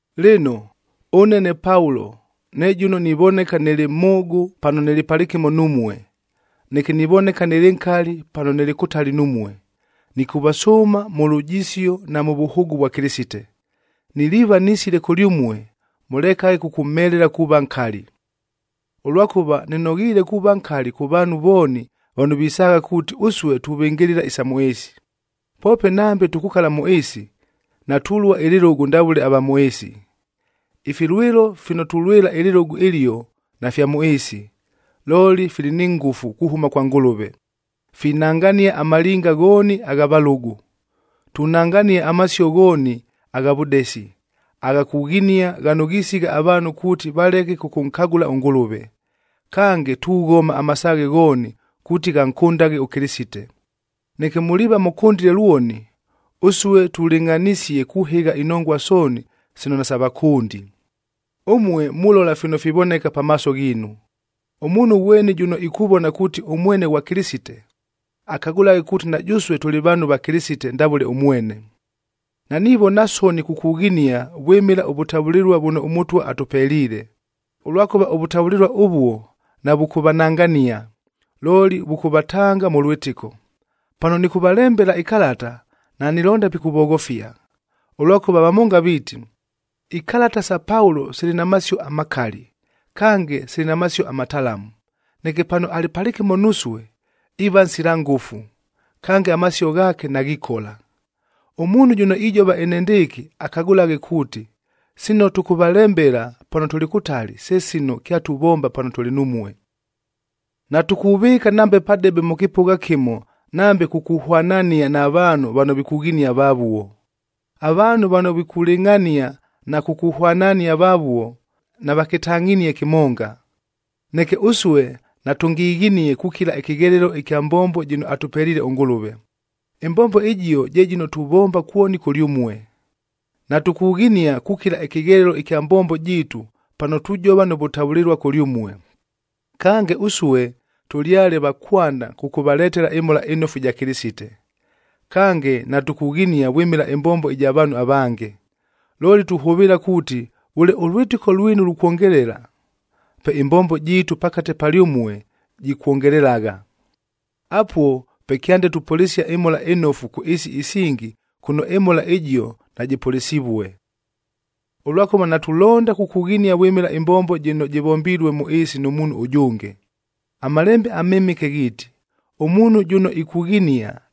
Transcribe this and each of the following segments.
Lɨno, ʉne ne Paulo ne jʉno nivoneka nɨlɨ mhʉʉgʉ pano nɨlɨ palɨkɨmo numue, neke nivoneka nɨlɨ nkali pano nɨlɨ kʉtali numue, nɨkʉvasʉʉma mʉ lujisio na mʉ vʉhʉʉgʉ vwa Kɨlɨsite, niliiva nisile kʉlyʉmue mʉlekaghe kʉkʉmhelela kuuva nkali. Ʉlwakʉva nɨnoghiile kuuva nkali kʉ vaanhu vooni vano visaagha kuuti ʉsue tuvɨngɨlɨla isa mʉ ɨɨsi. Poope nambe tukukala mʉ ɨɨsi, natulua ɨlɨlʉgʉ ndavʉle ava mʉ ɨɨsi. Ifilwɨlo fino tulwɨla ɨlɨlʉgʉ ɨlio nafya mʉ ɨɨsi, looli fili ni ngʉfu kuhʉma kwa Ngʉlʉve, finangania amalinga ghooni agha valʉgʉ. Tunangania amasio ghooni agha vʉdesi, agha kughinia ghano ghisigha avaanhu kuuti valeke kʉkʉnkagʉla ʉNgʉlʉve. Kange, tughoma amasaaghe ghooni kuuti ghankʉndaghe ʉKɨlɨsite. Neke muliiva mʉkʉndile lwoni, ʉsue tulɨngʼhanisie kuhɨgha inongua sooni sino nasa vʉkʉndi. Ʉmue mulola fino fivoneka pamaaso ghiinu. Ʉmuunhu ghweni jʉno ikuvona kuuti ʉmwene ghwa Kɨlɨsite, akagʉlaghe kuuti na jʉsue tʉlɨ vaanhu va Kɨlɨsite, ndavʉle ʉmwene. Nanivona soni kukughinia vwɨmɨla ʉvʉtavʉlɨlua vʉno ʉMʉtwa atʉpeliile, ʉlwakʉva ʉvʉtavʉlɨlua ʉvuo navʉkʉvanangania, looli vʉkʉvatanga mʉ lwɨtɨko. Pano nɨkʉvalembela ikalata, nanilonda pikʉvoghofia. Ʉlwakʉva vamonga viiti, “Ikalata sa Paulo sili na masio amakali, kange sili na masio amatalamu. Neke pano alɨ palɨkɨmo nusue iiva nsila ngʉfu, kange amasio ghaake naghikola.” Ʉmuunhu jʉno ijova enendɨɨkɨ akagʉlaghe kuuti, sino tʉkʉvalembela pano tʉlɨ kʉtali, se sino kyatuvomba pano tʉlɨ numue. Natukuvɨɨka nambe padebe mʉ kɨpʉgha kɨmo nambe kukuhwanania na vaanhu vano vikughinia vavuo. Avaanhu vano vikulɨngʼhania na kukuhwanania vavuo, navakɨtangʼhinie kɨmonga. Neke ʉsue natʉngighinie kukila ɨkɨghelelo ɨkya mbombo jɨno atʉpeliile ʉNgʉlʉve. Ɨmbombo ɨjio je jɨno tuvomba kwoni kʉlyʉmue. Natukughinia kukila ɨkɨghelelo ɨkya mbombo jiitu pano tujova nʉ vʉtavʉlɨlua kʉlyʉmue, kange ʉsue tʉlyale va kwanda kʉkʉvaletela ɨMhola ɨNofu ɨja Kɨlɨsite. Kange, natukughinia vwɨmɨla ɨmbombo ɨja vaanhu avange. Looli tuhʉvɨɨla kuuti vʉle ʉlwɨtɨko lwinu lukwongelela, pe ɨmbombo jiitu pakate palyʉmue jikwongelelagha. Apuo pe kyande tupʉlɨsia ɨMhola ɨNofu kʉ ɨɨsi isingi kʉno ɨMhola ɨjio najɨpʉlɨsivue. Ʉlwakʉva natulonda kukughinia vwɨmɨla ɨmbombo jɨno jɨvombilue mʉ ɨɨsi nʉ muunhu ʉjʉnge. AMalembe aMɨmɨke ghiiti, “Ʉmuunhu jʉno ikughinia,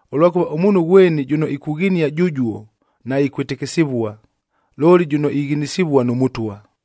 Ʉlwakʉva ʉmuunhu ghweni jʉno ikughinia jʉjuo naikwɨtɨkɨsɨvua, looli jʉno ighinisivua nʉ Mʉtwa.